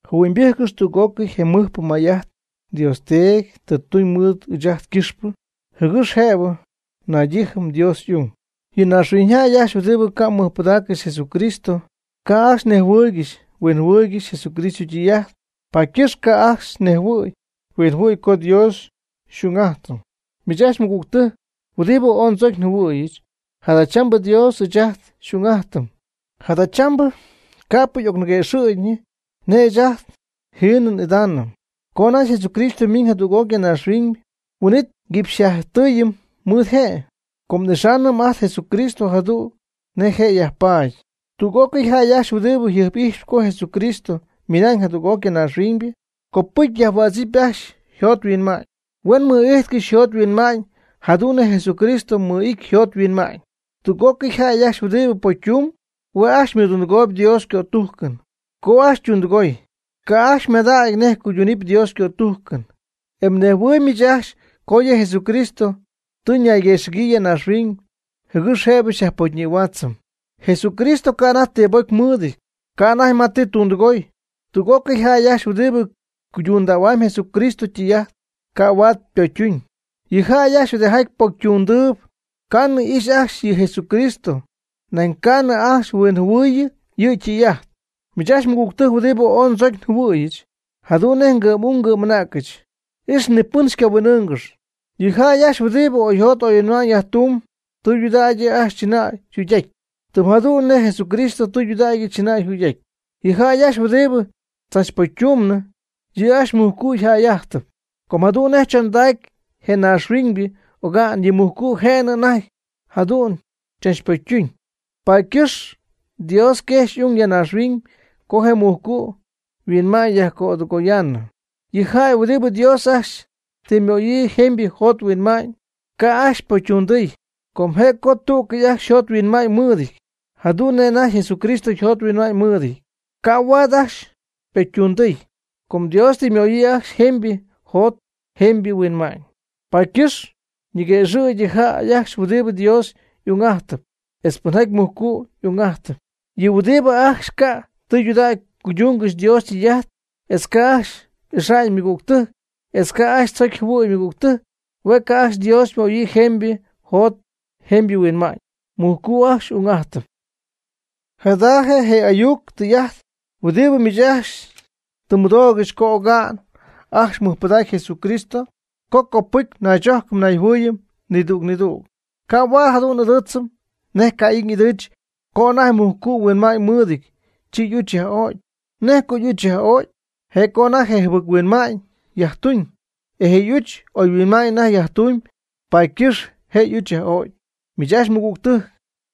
Jɨhuɨ'ñybɨjccɨx tüg'ócɨy je mɨjpɨ may'ajt Dios Teedy tɨ tuñ mɨɨd ɨɨch'ajt ycɨxpɨ jɨgɨx jëbɨ naydijɨm Dios y'ung. Yɨ naaxhuiñyjäy ajcxy huɨdibɨ ca' mɨjpɨdaaccɨxy Jesucristo ca' ajcxy nejhuɨɨygɨxy huinjɨhuɨɨygɨxy Jesucristo ytɨy'ajt, paady ycɨxp ca' ajcxy nejhuɨ̈y huinjɨhuɨ̈y co Dios xy'ung'ajtɨm. Miich ajcxy mɨgügtɨjc huɨdibɨ ooy ndzocy njɨhuɨ̈yɨch, jadachambɨ Dios ɨɨch ajt xy'ung'ajtɨm. Jadachambɨ ca'p y'ocniguëxɨ̈gyñɨ nej ɨɨch ajt jiinɨ n'idaanɨm. Co anajty Jesucristo ymiiñ jadüg'oc ya naaxhuiñ, huin'it nguipxyjatytɨɨyɨm mɨɨd je', com n'ixaanɨm ajt Jesucristo jadu'n nej je' yajpaady. Tüg'ócɨy jäy ajcxy huɨdibɨ jɨjp'ijxp co Jesucristo ymiina'ñ jadüg'oc ya naaxhuiñ, copɨcy yajhuädzɨpy ajcxy yjot yhuinma'ñ. Huen mɨ'ijtcɨxy oyjot oyhuinma'ñ jadu'n nej Jesucristo mɨ'ity oyjot oyhuinma'ñ. Tüg'ócɨy jäy ajcxy huɨdibɨ pocytumb, hue' ajcxy ymɨdundɨgooyb Dios ycötujcɨn. Co ajcxy ytundɨgoy, ca' ajcxy ymadägy nej cuydunɨpy Dios ycötujcɨn. E mnejhuɨɨyb miich ajcxy co yɨ Jesucristo tɨ ñayguëxɨ̈gyii ya naaxhuiñ jɨgɨx jëbɨ xyajpocyñïhuaatzɨm. Jesucristo ca' anajty ti pocy mɨɨdɨty, ca' anajty ma tɨ ytundɨgoy. Tüg'ócɨy jäy ajcxy huɨdibɨ cuydundähuam Jesucristo ytɨy'ajt, ca' huaad pocytuñ. Yɨ jäy ajcxy huɨdijaty pocytundɨɨb, ca'nɨ ixy ajcxy yɨ Jesucristo, nañ ca'nɨ ajcxy huinjɨhuɨɨyɨ yɨ' ytɨy'ajt. Miich ajcxy mɨgügtɨjc huɨdibɨ ooy ndzocy njɨhuɨ̈yɨch jadu'n nej ngɨ'm'ung ngɨ'm'anäcɨch, ix ni pɨn xycahuin'ɨɨngɨx. Yɨ jäy ajcxy huɨdibɨ oyjot oyhuinma'ñ yajtumb, tɨydudägy yɨ' ajcxy chɨnäy yjugy'ajty, tɨm jadu'n nej Jesucristo tɨydudägy chɨnay yjugy'ajty. Yɨ jäy ajcxy huɨdibɨ tzachpocytundɨɨbnɨ, yɨ' ajcxy mujcu' yjäy'ajtɨp. Com jadu'n nej chondacy je naaxhuiñybɨ oga'n yɨ mujcu' jënɨ anajty jadu'n chachpocytuñ. Paady ycɨxp Dios quejxy y'ung ya naaxhuiñ co je mujcu' yhuinma'ñ yajcödɨgoyaanɨ. Yɨ jäy huɨdibɨ Dios ajcxy tɨ ymöyii jemybɨ jot jemybɨ huinma'ñ, ca' ajcxy ypocytundɨɨy com je'co tú'cɨy ajcxy yjot yhuinma'ñ mɨɨdɨty, jadu'n nej anajty Jesucristo yjot yhuinma'ñ mɨɨdɨty, ca' huaad ajcxy ypocytundɨɨy com Dios tɨ ymöyii ajcxy jemybɨ jot jemybɨ huinma'ñ. Paady ycɨxp yñiguëxɨ̈gy yɨ jäy ajcxy pɨnjaty Dios y'ung'ajtɨp etz pɨnjaty mujcu' ung'ajtɨp. Yɨ huɨdibɨ ajcxy ca' tɨydudägy cuydungɨxy Dios ytɨy'ajt etz ca' ajcxy ixa'ñ ymɨgügtɨjc, etz ca' ajcxy tzocy jɨhuɨ̈y ymɨgügtɨjc, hue' ca' ajcxy Dios ymöyii jemybɨ jot jemybɨ huinma'ñ, mujcu' ajcxy y'ung'ajtɨp. Jada je' je ayuc tɨy'ajt huɨdibɨ miich ajcxy tɨ mmɨdoogɨxy co oga'n ajcxy mmɨjpɨdacy Jesucristo co copɨcy naychojcɨm nayjɨhuɨɨyɨm nidüg nidüg. Ca' huaad jadu'n n'ɨdɨɨtzɨm nej Caín y'ɨdɨɨch co anajty mujcu' huinma'ñ mɨɨdɨty, chi y'uch yaj'o'cy. ¿Nej co y'uch yaj'o'cy? Je' co anajty je' jɨbɨc-huinma'ñ yajtuñ, e je' y'uch oyhuinma'ñ anajty yajtumyb paady ycɨxp je y'uch yaj'o'cy. Miich ajcxy mɨgügtɨjc,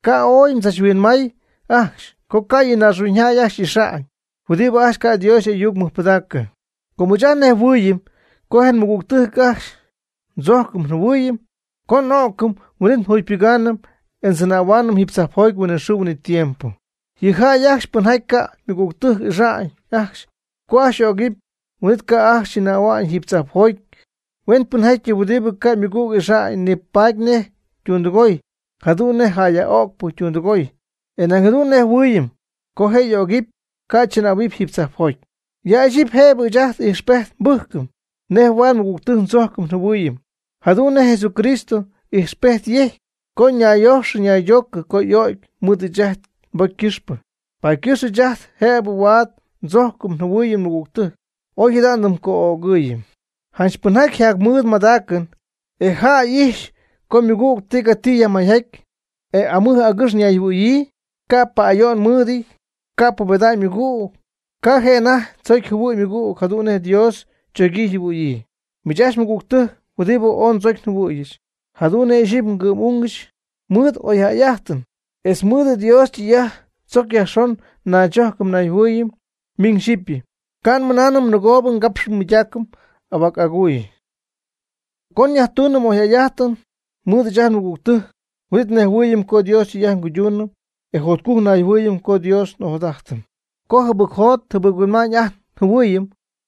ca' ooy mdzachhuinmaay ajcxy co ca' yɨ naaxhuiñyjäy ajcxy xy'ixa'ñ, huɨdibɨ ajcxy ca' Dios y'ayuc mɨjpɨdaacɨ. Com ɨɨch ajt nnejhuɨɨyɨm co je nmɨgügtɨjc ajcxy ndzojcɨm njɨhuɨɨyɨm co n'o'cɨm, huin'it njugypɨgaanɨm e ndzɨnähaanɨm jiiby tzajpjoty huinɨxɨɨ huinɨtiempo. Yɨ jäy ajcxy pɨnjaty ca' ymɨgügtɨjc ixa'ñ ajcxy co ajcxy y'ögɨpy, huin'it ca' ajcxy chɨnähua'ñ jiiby tzajpjoty. Huenpɨnjäyɨty huɨdibɨ ca' ymɨgüg ixa'ñ, nipatpy nej ytundɨgoy jadu'n nej jäyyaj'o'cpɨ ytundɨgoy e nañ jadu'n nejhuɨɨyɨm, co je' y'ögɨpy, ca' chɨnähua'ñ jiiby tzajpjoty. Ya ixyipy jëbɨ ɨɨch ajt ijxpejt nbɨjcɨm nej huaad mɨgügtɨjc ndzojcɨm njɨhuɨɨyɨm, jadu'n nej Jesucristo ijxpejt yejcy co ñayyojxɨ ñaydoocɨ co y'o'cy mɨɨd ɨɨch ajt nbocy ycɨxpɨ. Paady ycɨxp ɨɨch ajt jëbɨ huaad ndzojcɨm njɨhuɨɨyɨm nmɨgügtɨjc, oy jada ndɨmco'ögɨɨyɨm. Janch pɨnjaty yjamɨɨd ymadaacɨn, e yja'ijxpy co ymɨgüg tigati yajmayjaty, e amɨj agɨx ñayjɨhuɨ̈yii, ca' pa'ayo'n mɨɨdɨty, ca' pubeda'ñ ymɨgüg, ca' je' anajty tzocy jɨhuɨ̈y ymɨgüg jadu'n nej Dios chogyii yjɨhuɨ̈yii. Miich ajcxy mɨgügtɨjc huɨdibɨ ooy ndzocy njɨhuɨ̈yɨch jadu'n nej ixyipy ngɨ'm'ungɨch, mɨɨd oyjäy'ajtɨn etz mɨɨd Dios ytɨy'ajt tzoc yajxon naychojcɨm nayjɨhuɨɨyɨm miñ xyɨpy. Ca' nmɨnaanɨm nɨgoo ngapxɨm nmɨydaacɨm ahuac aguuy. Co nyajtuunɨm oyjäy'ajtɨn mɨɨd ɨɨch ajt nmɨgügtɨjc, huin'it nejhuɨɨyɨm co Dios ytɨy'ajt nguyduunɨm e jotcujc nayjɨhuɨɨyɨm co Dios n'ojadajtɨm. Co jɨbɨc njot nhuinma'ñ ajt njɨhuɨɨyɨm,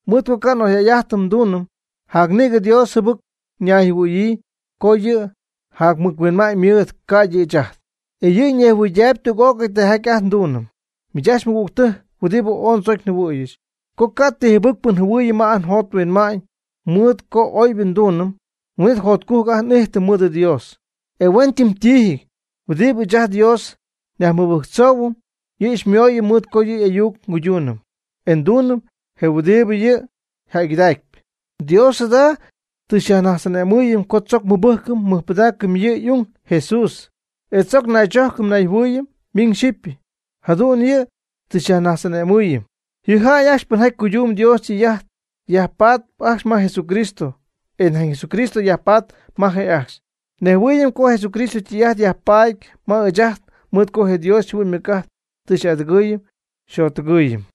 mɨɨd co ca' oyjäy'ajtɨn nduunɨm, jac nïgɨ Dios jɨbɨc ñayjɨhuɨ̈yii com yɨ' jacmɨjhuinma'ñ mɨɨd, ca'ydɨ ɨɨch ajt, e yɨ' nejhuɨydaayb tüg'ócɨy tijaty ajt nduunɨm. Miich ajcxy mɨgügtɨjc huɨdibɨ ooy ndzocy njɨhuɨ̈yɨch, co ca' ti jɨbɨcpɨ njɨhuɨɨyɨm ma ajt njot nhuinma'ñ mɨɨd co oybɨ nduunɨm, huin'it jotcujc ajt n'ijtɨm mɨɨd Dios. E huentɨmtiijɨty huɨdibɨ ɨɨch ajt Dios nyajmɨbɨjctzoohuɨm, yɨ' xymooyɨm mɨɨd co yɨ' y'ayuc nguyduunɨm, e nduunɨm je huɨdibɨ yɨ' yjäygɨdacpy. Dios jada tɨ xyajnajtz'ane'mɨɨyɨm co tzoc mɨbɨjcɨm mɨjpɨdaacɨm yɨ' y'ung Jesús etz tzoc naychojcɨm nayjɨhuɨɨyɨm miñ xyɨpy, jadu'n yɨ' tɨ xyajnajtz'ane'mɨɨyɨm. Yɨ jäy ajcxy pɨnjaty cuydumb Dios ytɨy'ajt, yajpatp ajcxy ma Jesucristo e nañ Jesucristo yajpatp ma je'ajcxy. Nejhuɨɨyɨm co Jesucristo ytɨy'ajt yajpaady ma ɨɨch ajt mɨɨd co je Dios yjɨhuɨ'ñ ymɨc'ajt tɨ xy'adɨgɨɨyɨm xyjottɨgɨɨyɨm.